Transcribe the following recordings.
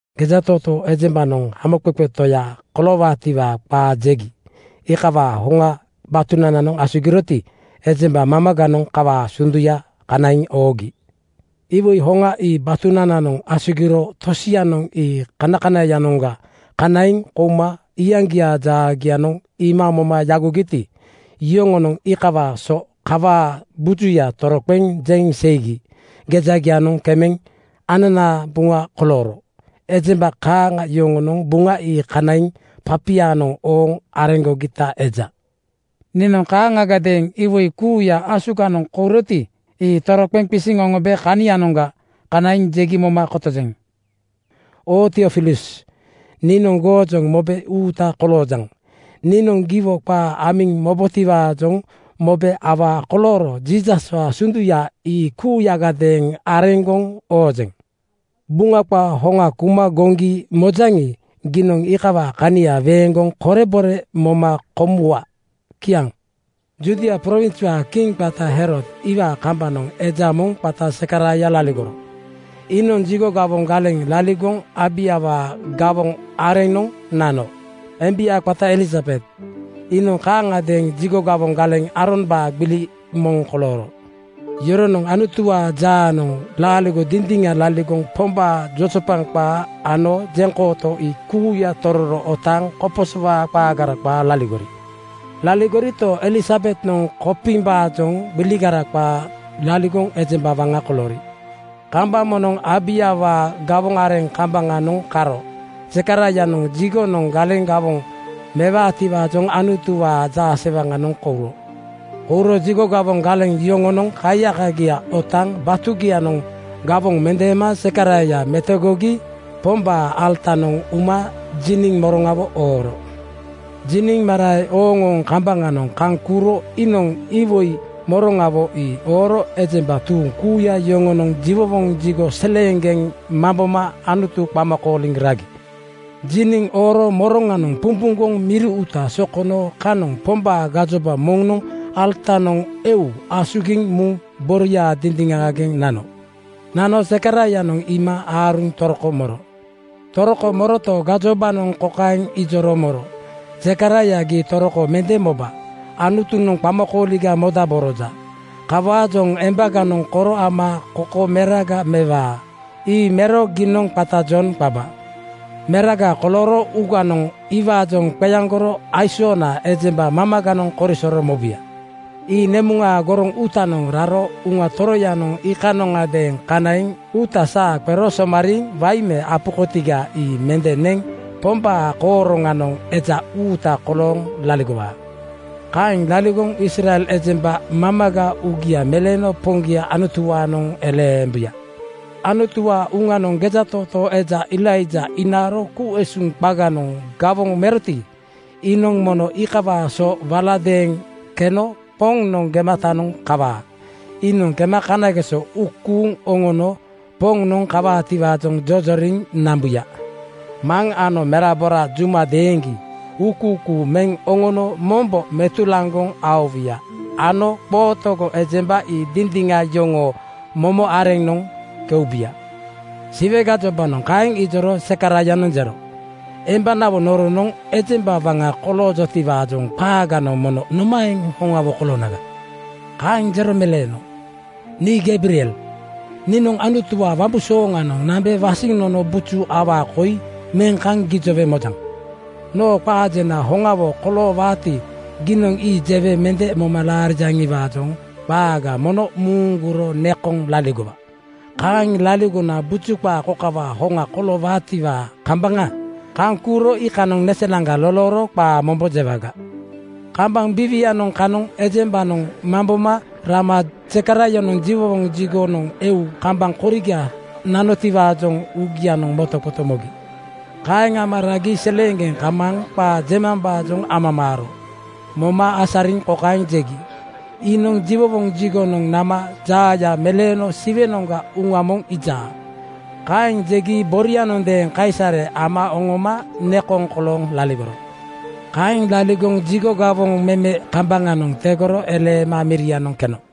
Gejatootoo ejembanoŋ Hamoqeqe Toya koloowaatiwaa qaa jegi iikawaa hoŋa batunananoŋ asugiroti, ejemba mamaganoŋ kawaa sunduya kanaiŋ oogi. Iwoi hoŋa ii batunananoŋ asugiro tosianoŋ ii kanakanaiyanoŋga kanaiŋ kouma iyaŋgiaa jaagianoŋ iima moma yagogiti, yoŋonoŋ iikawaa so kawaa bujuya toroqeŋ jeŋ seigi gejanananoŋ kemeŋ ananaa buŋa kolooro. Ejemba kaaŋa yoŋonoŋ Buŋa ii kanaiŋ papianoŋ ooŋ areŋgogita eja. Niinoŋ kaaŋagadeeŋ iwoi kuuya asugiŋ kouroti, ii tororo qisiŋ oŋombe kanianoŋga kanaiŋ jegi moma kotojeŋ. Oo Tiofilus niinoŋ goojoŋ mobe uuta koloojaŋ. Niinoŋ giwo qaa amiŋ mobotiwaajoŋ mobe awaa kolooro Jiisaswaa sunduya ii kuuyagadeeŋ areŋgoŋ oojeŋ. Buŋa qaa hoŋa kuma goŋgi mojaŋi, giinoŋ iikawaa kania weeŋgoŋ korebore moma komuwa. Kiaŋ. Judia prowinswaa kiŋ qata Herod iwaa kambaŋanoŋ eja moŋ qata Zekaraia laligoro. Iinoŋ jigo gawoŋ galeŋ laligoŋ Abaiawaa gawoŋ areŋnoŋ nano. Embia qata Elisabet iinoŋ kaaŋagadeeŋ jigo gawoŋ galeŋ Aarombaa gbili moŋ kolooro. Yoronoŋ Anutuwaa jaanoŋ laaligo dindiŋa laligoŋ Pombaa jojopaŋ qaa ano jeŋkooto ii kuuya tororo otaaŋ koposowaa qaagara qaa laligori. Laligorito, Elisabetnoŋ kopimbaajoŋ gbiligara qaa laligoŋ ejemba waŋa koloori. Kambaŋ moŋnoŋ Abaiawaa gawoŋ areŋ kambaŋanoŋ karo Zekaraianoŋ jigonoŋ galeŋ gawoŋ mewaatiwaajoŋ Anutuwaa jaasewaŋanoŋ kouro. Kouro jigo gawoŋ galeŋ yoŋonoŋ kaiyakagia otaaŋ batugianoŋ gawoŋ mendeema Zekaraia metogogi Pombaa alatanoŋ uma jiniŋ moroŋawo ooro. Jiniŋ marae ooŋooŋ kambaŋanoŋ kaŋ kuuro iinoŋ iwoi moroŋawo ii ooro ejemba tuuŋ kuuya yoŋonoŋ jiwowoŋ jigo seleeŋgeŋ mamboma Anutu qama kooliŋ ragi. Jiniŋ ooro moroŋanoŋ pumpuŋgoŋ miri uuta sokono kanoŋ Pombaa gajoba moŋnoŋ alatanoŋ eu asugiŋ muŋ boria dindiŋaageŋ nano. Nano Zekaraianoŋ iima aaruŋ toroko moro. Toroko moroto, gajobanoŋ kokaeŋ ijoro moro, “Zekaraia, gii toroko mende moba. Anutunoŋ qamakooliga modaboroja. Kawaajoŋ embaganoŋ koro ama koko meraga mewaa. Ii mero giinoŋ qata Jon qaba. Meraga kolooro uuganoŋ iwaajoŋ qeaŋgoro aisoona ejemba mamaganoŋ korisoro mobuya. Ii nemuŋaa goroŋ uutanoŋ raro Uŋa Toroyanoŋ iikanondeeŋ kanaiŋ uuta saa qero somariiŋ wain me apu kotiga ii mende neŋ Pombaa kooroŋanoŋ eja uuta kolooŋ laligowaa. Kaeŋ laligoŋ Israel ejemba mamaga uugia meleeno Poŋgia Anutuwaanoŋ eleembuya. Anutuwaa Uŋanoŋ gejatootoo eja Elaija inaaro ku-usuŋ qaganoŋ gawoŋ meroti, iinoŋ mono iikawaa so waladeeŋ keno Poŋnoŋ gematanoŋ kawaa. Iinoŋ kema kanageso uu kuuŋ oŋono Poŋnoŋ kawaatiwaajoŋ jojoriŋ nambuya. Maŋ ano merabora juma deeŋgi uukuukuu meŋ oŋono mombo metulaŋgoŋ aowuya ano qootogo ejemba ii dindiŋa yoŋoo momo areŋnoŋ keubuya.” Siwe gajobanoŋ kaeŋ ijoro Zekaraianoŋ jero, “Embanawo noronoŋ ejemba waŋa koloojotiwaajoŋ qaaganoŋ mono nomaeŋ hoŋawo koloonaga?” Kaeŋ jero meleeno, “Nii Geibriel. Niinoŋ Anutuwaa wambu-sooŋanoŋ nambe wasiŋ nono buju awaa koi meŋ kaŋ gijowe mojaŋ. Noo qaa jena hoŋawo koloowaati, giinoŋ ii jewe mende moma laarijaŋiwaajoŋ qaaga mono muuŋgoro nekoŋ laligowa. Kaeŋ laligona buju qaa kokawaa hoŋa koloowaatiwaa kambaŋa kaŋ kuuro iikanoŋ neselaŋga lolooro qaa mombo jewaga.” Kambaŋ biiwianoŋ kanoŋ ejembanoŋ mamboma rama Zekaraianoŋ jiwowoŋ jigonoŋ eu kambaŋ koriga nanotiwaajoŋ uugianoŋ motoqoto mogi. Kaeŋ ama ragi seleeŋgeŋ kamaaŋ qaa jemambaajoŋ amamaaro moma asariŋ kokaeŋ jegi, “Iinoŋ jiwowoŋ jigonoŋ nama jaaya meleeno Siwenoŋga uŋa moŋ iija.” Kaeŋ jegi borianondeeŋ kaisare ama oŋoma nekoŋ kolooŋ laligoro. Kaeŋ laligoŋ jigo gawoŋ meme kambaŋanoŋ tegoro eleema mirianoŋ keno.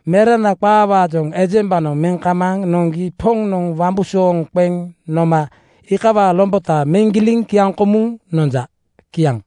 “Merana qaawaajoŋ ejembanoŋ meŋ kamaaŋ noŋgi Poŋnoŋ wambusooŋ qeŋ noma iikawaa lombota meŋ giliŋ kiaŋkomuŋ nonja.” Kiaŋ.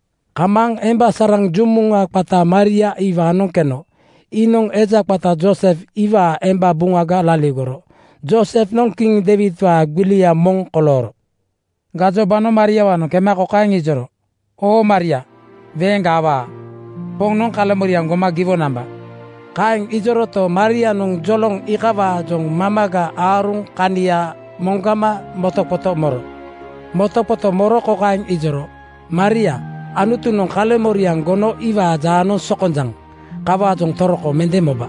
Kamaaŋ emba saraŋ jumuŋa qata Maria iwaanoŋ keno. Iinoŋ eja qata Joosef iwaa emba buŋaga laligoro. Joosefnoŋ kiŋ Deiwidwaa gbilia moŋ kolooro. Gajobanoŋ Mariawaanoŋ kema kokaeŋ ijoro, “Oo Maria, weeŋga awaa. Poŋnoŋ kaleŋmoriaŋ goma giwo namba.” Kaeŋ ijoroto, Marianoŋ joloŋ iikawaajoŋ mamaga aaruŋ kania moŋgama motoqoto moro. Motoqoto moro kokaeŋ ijoro, “Maria, Anutunoŋ kaleŋmoriaŋ gono iwaa jaanoŋ sokonjaŋ. Kawaajoŋ toroko mende moba.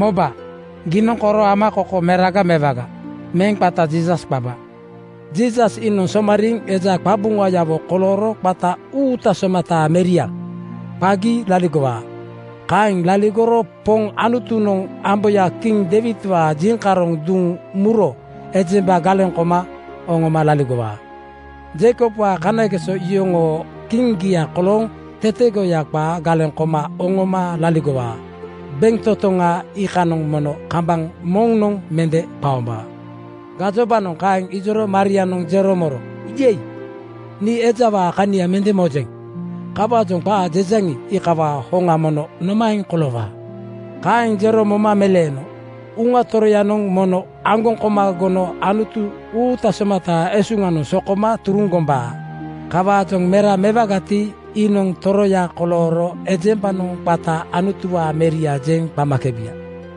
Moba, giinoŋ koro ama koko meraga mewaga. Meŋ qata Jiisas qaba. Jiisas iinoŋ somariiŋ eja qabuŋayawo kolooro qata ‘Uuta somataa Meria,’ qagi laligowaa. Kaeŋ laligoro Poŋ Anutunoŋ amboya kiŋ Deiwidwaa jiŋkaroŋ duŋ muro ejemba galeŋ koma oŋoma laligowaa. Jeikobwaa kanageso yoŋoo kiŋgia kolooŋ tetegoya qaa galeŋ koma oŋoma laligowaa. Bentotoŋa iikanoŋ mono kambaŋ moŋnoŋ mende qaombaa.” Gajobanoŋ kaeŋ ijoro Marianoŋ jero moro, “Yei! Nii ejawaa kania mende mojeŋ. Kawaajoŋ qaa jejaŋi, iikawaa hoŋa mono nomaeŋ koloowaa?” Kaeŋ jero moma meleeno, “Uŋa Toroyanoŋ mono aŋgoŋ koma gono Anutu uuta somataa esuŋanoŋ sokoma turuŋ gombaa. Kawaajoŋ mera mewagati, iinoŋ toroya kolooro ejembanoŋ qata ‘Anutuwaa Meria,’ jeŋ qamakebuya.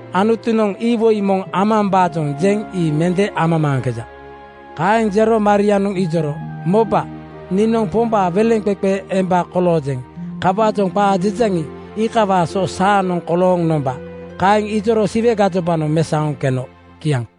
Anutunoŋ iwoi moŋ amambaajoŋ jeŋ ii mende amamaaŋkeja.” Kaeŋ jero Marianoŋ ijoro, “Moba, niinoŋ Pombaa weleŋqeqe emba koloojeŋ. Kawaajoŋ qaa jejaŋi, iikawaa so saanoŋ kolooŋ nomba.” Kaeŋ ijoro Siwe gajobanoŋ mesaoŋ keno. Kiaŋ.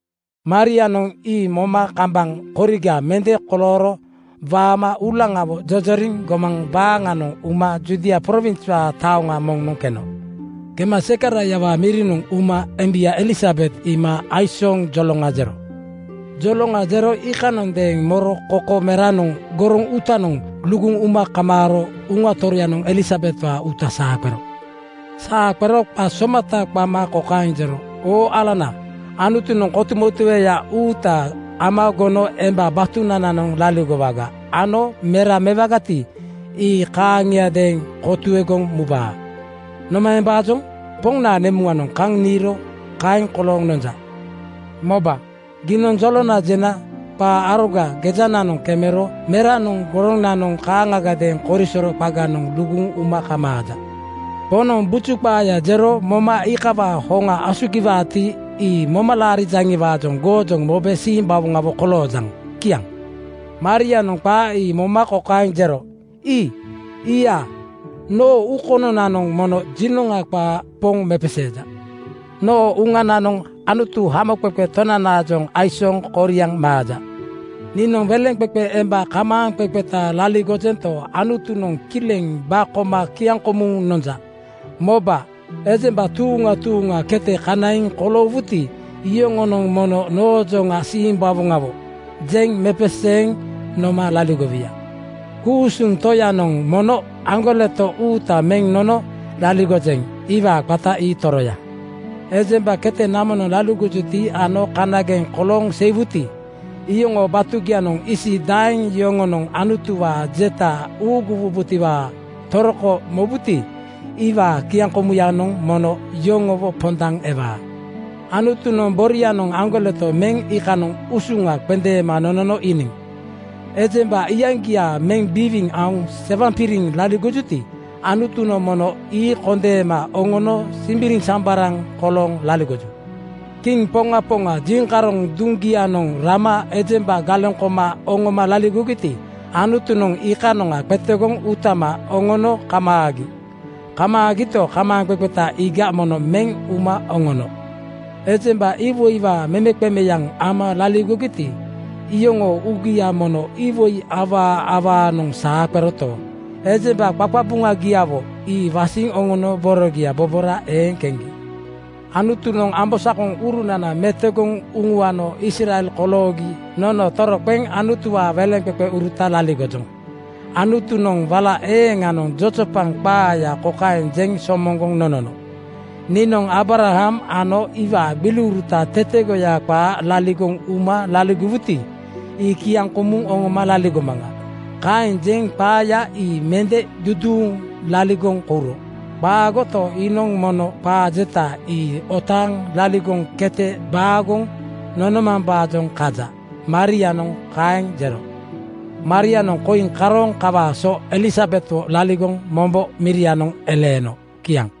Marianoŋ ii moma kambaŋ koriga mende kolooro waama uulaŋawo jojoriŋ gomaŋ baaŋanoŋ uma Judia prowinswaa taoŋa moŋnoŋ keno. Kema Zekaraiawaa mirinoŋ uma embia Elisabet iima aisooŋ joloŋa jero. Joloŋa jero iikanondeeŋ moro koko meranoŋ goroŋ uutanoŋ luguŋ uma kamaaro Uŋa Toroyanoŋ Elisabetwaa uuta saa qero. Saa qero qa somata qama kokaeŋ jero, “Oo alana, Anutunoŋ kotumotueya uuta ama gono emba batunananoŋ laligowaga ano mera mewagati, ii kaaŋiadeeŋ kotuegoŋ mubaa. Nomaembaajoŋ Poŋnaa nemuŋanoŋ kaŋ niiro kaeŋ kolooŋ nonja? Moba, gii jolona jena qaa aroga gejananoŋ kemero meranoŋ goronanoŋ kaaŋagadeeŋ korisoro qaganoŋ luguŋ uma kamaaja. Poŋnoŋ buju qaaya jero moma iikawaa hoŋa asugiwaati, ii moma laarijaŋiwaajoŋ goojoŋ mobe simbawoŋawo koloojaŋ.” Kiaŋ. Marianoŋ qaa ii moma kokaeŋ jero, “Ii-ia! Noo uu kononanoŋ mono jinoŋa qaa Poŋ mepeseeja. Noo uŋananoŋ Anutu, Hamoqeqe Tonaajoŋ aisooŋ koriaŋ maaja. Niinoŋ weleŋqeqe emba kamaaŋqeqeta laligojento, Anutunoŋ kileŋ ba koma kiaŋkomuŋ nonja. Moba, ejemba tuuŋa tuuŋa kete kanaiŋ koloowuti, yoŋonoŋ mono noojoŋa ‘Simbawoŋawo!’ jeŋ mepeseeŋ noma laligowuya. Ku-usuŋ Toyanoŋ mono aŋgoleto uuta meŋ nono laligojeŋ. Iwaa qata ii Toroya. Ejemba kete namonoŋ laligojuti ano kanageŋ kolooŋ seiwuti, iyoŋoo batugianoŋ isi daeŋ yoŋonoŋ Anutuwaa jeta uuguwubotiwaa toroko mobuti, iwaa kiaŋkomuyanoŋ mono yoŋowo pondaŋ ewaa. Anutunoŋ borianoŋ aŋgoleto meŋ iikanoŋ usuŋa qendeema nonono iiniŋ. Ejemba iyaŋgia meŋ biwiiŋ aoŋ sewaŋpiriŋ laligojuti, Anutunoŋ mono ii kondeema oŋono simbiriŋsambaraŋ kolooŋ laligoju. Kiŋ poŋa poŋa jiŋkaroŋ duŋgianoŋ rama ejemba galeŋ koma oŋoma laligogiti, Anutunoŋ ii iikanoŋa qetegoŋ utama oŋono kamaagi. Kamaagito, kamaaŋqeqeta iiga mono meŋ uma oŋono. Ejemba iwoiwaa memeqemeyaŋ ama laligogiti, iyoŋoo uugia mono iwoi awaa awaanoŋ saa qeroto, ejemba qaqabuŋagiawo ii wasiŋ oŋono borogia bobora eeŋ keŋgi. Anutunoŋ ambosakoŋurunana metogoŋ uŋuano Israel koloogi nono toroqeŋ Anutuwaa weleŋqeqeuruta laligojoŋ. Anutunoŋ wala eeŋanoŋ jojopaŋ qaaya kokaeŋ jeŋ somoŋgoŋ nonono, ‘Niinoŋ Aabram ano iwaa gbiliuruta tetegoya qaa laligoŋ uma laligowuti, ii kiaŋkomuŋ oŋoma laligomaŋa.’ Kaeŋ jeŋ qaaya ii mende duduuŋ laligoŋ kouro. Qaagoto, iinoŋ mono qaa jeta ii otaaŋ laligoŋ kete baagoŋ nonomambaajoŋ kaja.” Marianoŋ kaeŋ jero. Marianoŋ koiŋ karooŋ kawaa so Elisabetwo laligoŋ mombo mirianoŋ eleeno. Kiaŋ.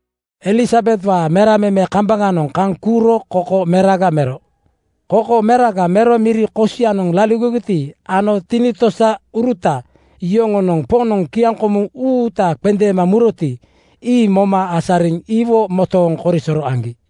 Elisabetwaa mera meme kambaŋanoŋ kaŋ kuuro koko meraga mero. Koko meraga mero miri kosianoŋ laligogiti ano tinitosauruta yoŋonoŋ Poŋnoŋ kiaŋkomu uuta qendeema muroti, ii moma asariŋ iwo motooŋ korisoro aŋgi.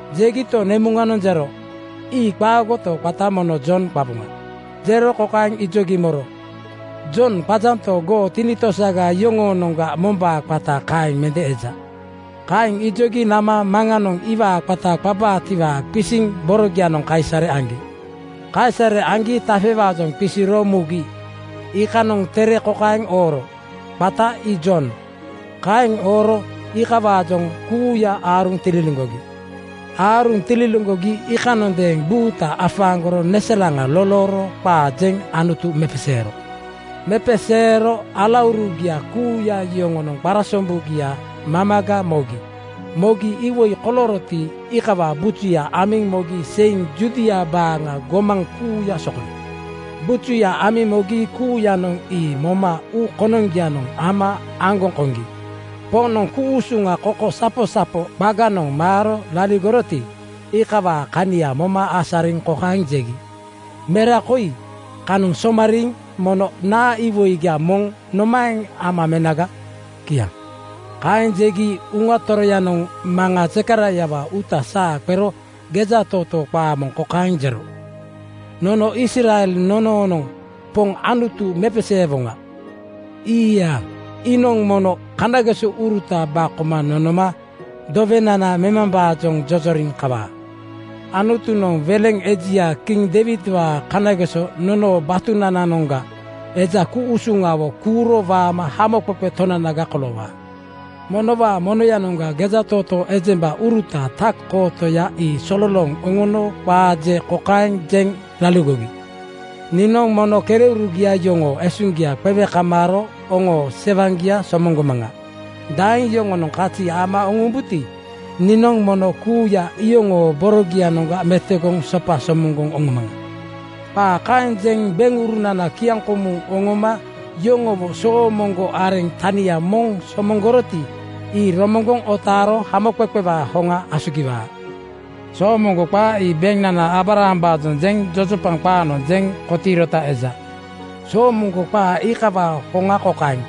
Jegito, nemuŋanoŋ jero, “Ii qaagoto, qata mono Jon qaboŋa.” Jero kokaeŋ ijogi moro, “Jon qajanto, goo tinitosaga yoŋoonoŋga mombaa qata kaeŋ mende eja.” Kaeŋ ijogi nama maŋanoŋ iwaa qata qabaatiwaa qisiŋ borogianoŋ kaisare aŋgi. Kaisare aŋgi tafewaajoŋ qisiro mugi iikanoŋ tere kokaeŋ ooro, “Qata ii Jon.” Kaeŋ ooro iikawaajoŋ kuuya aaruŋ tililiŋgogi. Aaruŋ tililiŋgogi iikanondeeŋ buuta afaaŋgoro neselaŋa lolooro qaa jeŋ Anutu mepeseero. Mepeseero alaurugia kuuya yoŋonoŋ qarasombugia mamaga mogi. Mogi iwoi kolooroti, iikawaa bujuya amiŋ mogi seiŋ Judia baaŋa gomaŋ kuuya sokono. Bujuya amiŋ mogi kuuyanoŋ ii moma uu konoŋgianoŋ ama aŋgoŋ koŋgi. Poŋnoŋ ku-usuŋa kokosaposapo qaganoŋ maaro laligoroti, iikawaa kania moma asariŋ kokaeŋ jegi, “Mera koi kanoŋ somariiŋ mono naa iwoiga moŋ nomaeŋ ama menaga?” Kiaŋ. Kaeŋ jegi Uŋa Toroyanoŋ maŋa Zekaraiawaa uuta saa qero gejatootoo qaa kokaeŋ jero, “Nono Israel nonoonoŋ Poŋ Anutu mepeseewoŋa. Ii-ia! Iinoŋ mono kanagesouruta ba koma nonoma dowenana memambaajoŋ jojoriŋ kawaa. Anutunoŋ weleŋ ejia kiŋ Deiwidwaa kanageso nonoo batunananoŋga eja ku-usuŋawo kuuro waama Hamoqeqe Tonanaga koloowaa. Monowaa monoyanoŋga gejatootoo ejembauruta tak-kootoya ii sololooŋ oŋono qaa je kokaeŋ jeŋ laligogi, ‘Niinoŋ mono kereurugia yoŋoo esuŋgia qewe kamaaro oŋoo sewaŋgia somoŋgomaŋa. Daeŋ yoŋonoŋ kazi ama oŋombuti, niinoŋ mono kuuya iyoŋoo borogianoŋga metogoŋ sopa somoŋgoŋ oŋomaŋa.’ Qaa kaeŋ jeŋ beŋurunana kiaŋkomuŋ oŋoma yoŋowo soomoŋgo areŋ tania moŋ somoŋgoroti, ii romoŋgoŋ otaaro hamoqeqewaa hoŋa asugiwaa. Soomoŋgo qaa ii beŋnana Aabrahambaajoŋ jeŋ jojopaŋ qaanoŋ jeŋ kotiirota eja. Soomoŋgo qaa iikawaa hoŋa kokaeŋ: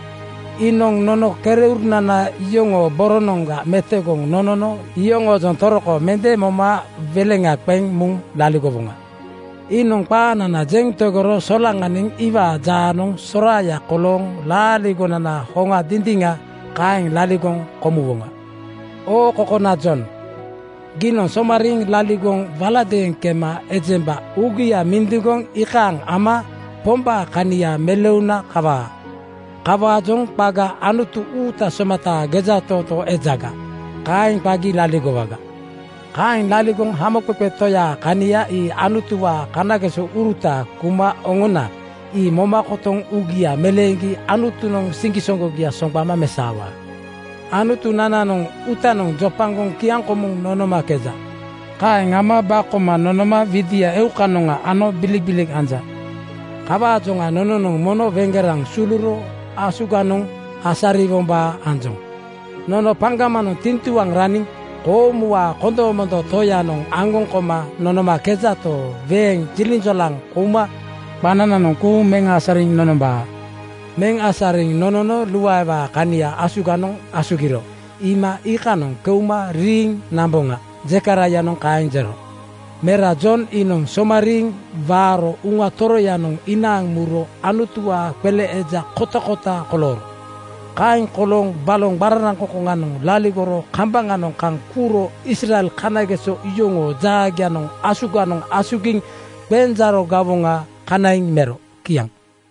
Iinoŋ nono kereurunana yoŋoo borogianoŋga metogoŋ nonono yoŋoojoŋ toroko mende moma weleŋa qeŋ muŋ laligowoŋa. Iinoŋ qaanana jeŋ tegoro solaŋaniŋ iwaa jaanoŋ soraaya kolooŋ laaligonana hoŋa dindiŋa kaeŋ laligoŋ komuwoŋa. Oo kokona Jon, giinoŋ somariiŋ laligoŋ waladeeŋ kema ejemba uugia mindiŋgoŋ iikaaŋ ama Pombaa kania meleuna kawaa. Kawaajoŋ qaga ‘Anutu uuta somataa gejatootoo ejaga,’ kaeŋ qagi laligowaga. Kaeŋ laligoŋ hamoqeqe Toyaa kania ii Anutuwaa kanagesouruta kuma oŋona ii moma kotoŋ uugia meleeŋgi Anutunoŋ siŋgisoŋgogia soŋgbama mesaowaa. Anutunananoŋ uutanoŋ jopagoŋ kiaŋkomuŋ nonomakeja. Kaeŋ ama ba koma nonoma widia eukanoŋa ano bilikbilik anja. Kawaajoŋa nononoŋ mono weŋgeraŋ suluro asuganoŋ asariwombaa anjoŋ. Nono paŋgamanoŋ tiŋtuaŋ raniŋ koomuwaa kondomondo Toyanoŋ aŋgoŋ koma nonomakejato, weeŋ jiliŋjolaŋ kouma qanananoŋ kuuŋ meŋ asariŋ nonombaa. Meŋ asariŋ nonono luaewaa kania asuganoŋ asugiro iima iikanoŋ keuma riiŋ namboŋa.” Zekaraianoŋ kaeŋ jero. Mera Jon iinoŋ somariiŋ waaro Uŋa Toroyanoŋ inaaŋ muro Anutuwaa qele eja kotakota kolooro. Kaeŋ kolooŋ baloŋ qararaŋkoŋkoŋanoŋ laligoro kambaŋanoŋ kaŋ kuuro Israel kanageso yoŋoo jaagianoŋ asuganoŋ asugiŋ qenjaaro gawoŋa kanaiŋ mero. Kiaŋ.